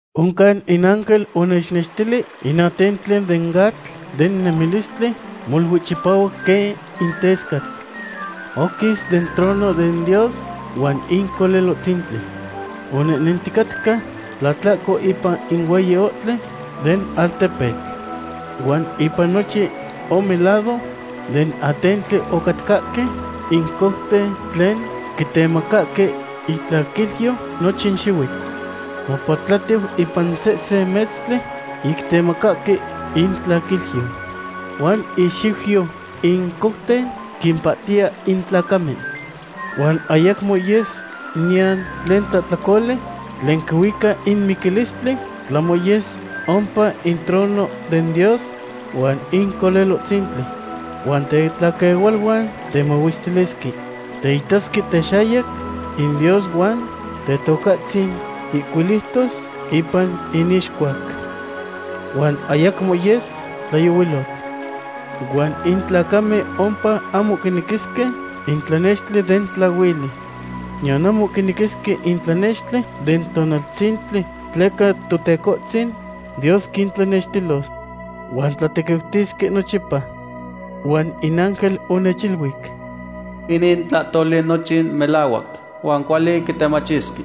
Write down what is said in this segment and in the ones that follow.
Oncan in ángel onechnextili in atentli den atl den nemilistli, molui chipahuac quen in tescatl. Oquis den trono den Dios huan in Colelohtzintli. Onehnenticatca tlatlahco ipan in hueyi ohtli den altepetl. Huan ipan nochin ome lado den atentli ocatcahque in couten tlen quitemacahque itlaquilyo nochin xihuitl. Mopatlatiu ipan sehsen metztli ic quitemacahque intlaquilyo. Huan ixiuyo in couten quimpahtiya in tlacamen. Huan ayacmo yes niyan tlen tlahtlacoli tlen quihuica in miquilistli, tlahmo yes ompa in trono den Dios huan in Colelohtzintli. Huan tetlaquehualuan temahuestilisque. Teitasque texayac in Dios huan Tetocahtzin ihcuiliutos ipan inixcuac. Huan ayacmo yes tlayohuilotl. Huan in tlacamen ompa ahmo quinequisque in tlanextli den tlahuili. Niyan ahmo quinequisque in tlanextli den tonaltzintli tleca Totecohtzin Dios quintlanextilos. Huan tlatequiutisque nochipa. Huan in ángel onechiluic: ―Inin tlahtoli nochin melahuac huan cuali quitemachisque.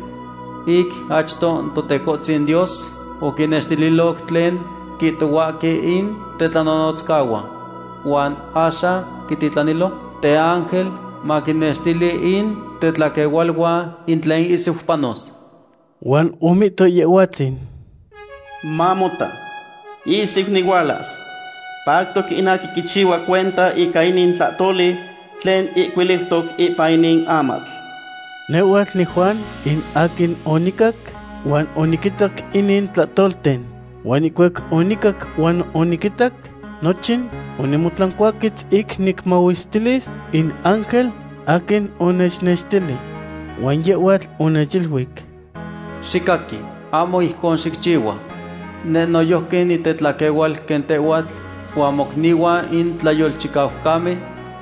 Ic achto in Totecohtzin Dios oquinextililoc tlen quihtohuahque in tetlanonotzcahuan. Huan axan quititlanilo teángel maquinextili in tetlaquehualuan in tlen ihsiu panos. Huan omihto Yehhuatzin: ―¡Mamota, ihsiu nihualas! Pactoc in aquin quichihua cuenta ica inin tlahtoli tlen ihcuiliutoc ipan inin amatl. Nehhuatl niJuan, in aquin onicac huan oniquitac inin tlahtolten. Huan ihcuac onicac huan oniquitac nochin, onimotlancuaquetz ic nicmahuestilis in ángel aquin onechnextili. Huan yehhuatl onechiluic: ―Xicaqui; ahmo ijcon xicchihua. Neh noyojqui nitetlaquehual quen tehhuatl huan mocnihuan in tlayolchicaucamen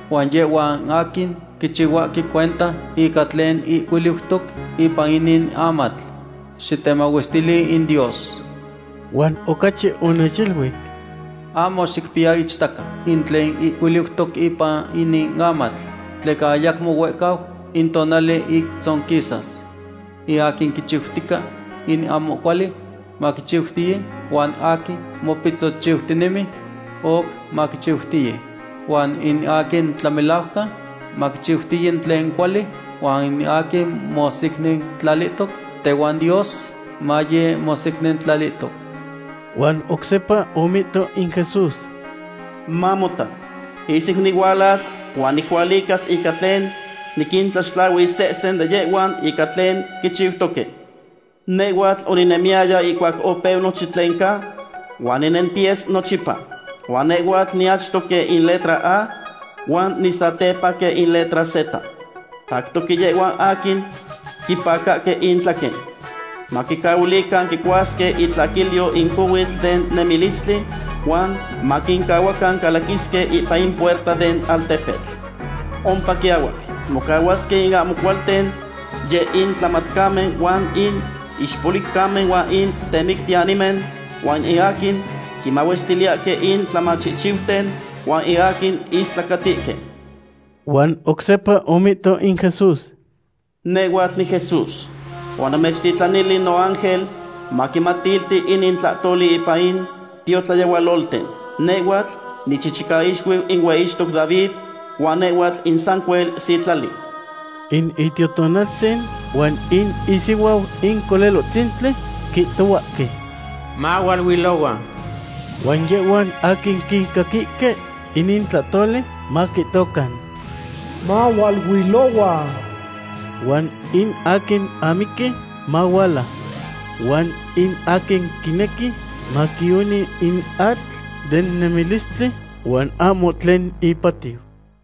huan yehhuan aquin quichihuahque cuenta ica tlen ihcuiliutoc ipan inin amatl. Xitemahuestili in Dios. Huan ocachi onechiluic: ―Ahmo xicpiya ichtaca in tlen ihcuiliutoc ipan inin amatl, tleca ayacmo huehcau in tonali ic tzonquisas. In aquin quichiutica in ahmo cuali, maquichiutiye, huan aquin mopitzochiutinemi, oc maquichiutiye. Huan in aquin tlamelajcan, maquichiutiye in tlen cuali, huan in aquin mosecnintlalihtoc tehuan Dios, maye mosecnintlalihtoc. Huan oc sepa omihto in Jesús: ―Mamota, ihsiu nihualas huan nicualicas ica tlen niquintlaxtlahuis sehsen de yehhuan ica tlen quichiutoque. Nehhuatl oninemiyaya ihcuac opeu nochin tlen ca, huan ninentiyes nochipa. Huan nehhuatl niachto quen in letra A, huan nisatepa quen in letra Z. Pactoque yehhuan aquin quipacahque intlaquen, maquincahuilican quicuasque itlaquilyo in cohuitl den nemilistli huan maquincahuacan calaquisque ipan in puerta den altepetl. Ompa quiahuac mocahuasque in ahmo cualten, yeh in tlamatcamen huan in ixpoliucamen huan in temictiyanimen, huan in aquin quimahuestiliyahque in tlamachihchiuten, huan in aquin istlacatihque. Huan oc sepa omihto in Jesús: ―Nehhuatl niJesús, huan onamechtitlanili noángel maquimatilti inin tlahtoli ipan in tiotlayehualolten. Nehhuatl nichichicaixuiu in hueyictoc David huan nehhuatl in sancuel sitlali. In Itiototaltzin huan in isihuau in Colelohtzintli quihtohuahque: ―Mahualuilohua. Huan yehhuan aquin quicaquihque inin tlatoli, maquihtocan: ―Mahualuilohua. Huan in aquin amiqui, mahuala. Huan in aquin quinequi, maquioni in atl den nemilistli huan ahmo tlen ipatiu.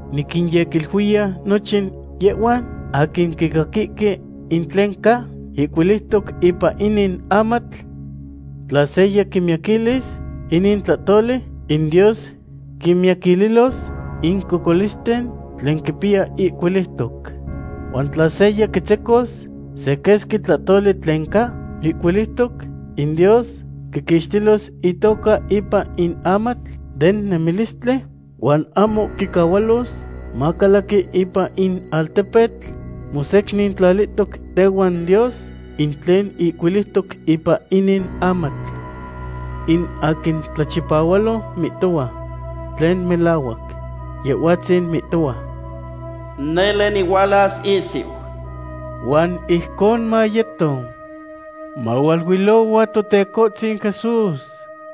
Niquinyequiluiya nochin yehhuan aquin quicaquihque in tlen ca ihcuiliutoc ipan inin amatl: Tla seya quimiyaquilis inin tlahtoli, in Dios quimiyaquililos in cocolisten tlen quipiya ihcuiliutoc. Huan tla seya quitzecos se quesqui tlahtoli tlen ca ihcuiliutoc, in Dios quiquixtilos itoca ipan in amatl den nemilistli huan ahmo quicahualos macalaqui ipan in altepetl mosecnintlalihtoc tehuan Dios, in tlen ihcuiliutoc ipan inin amatl. In aquin tlachipahualo mihtohua tlen melahuac. Yehhuatzin mihtohua: ―Nele nihualas ihsiu. Huan ijcon mayeto. ¡Mahualuilohua, Totecohtzin Jesús!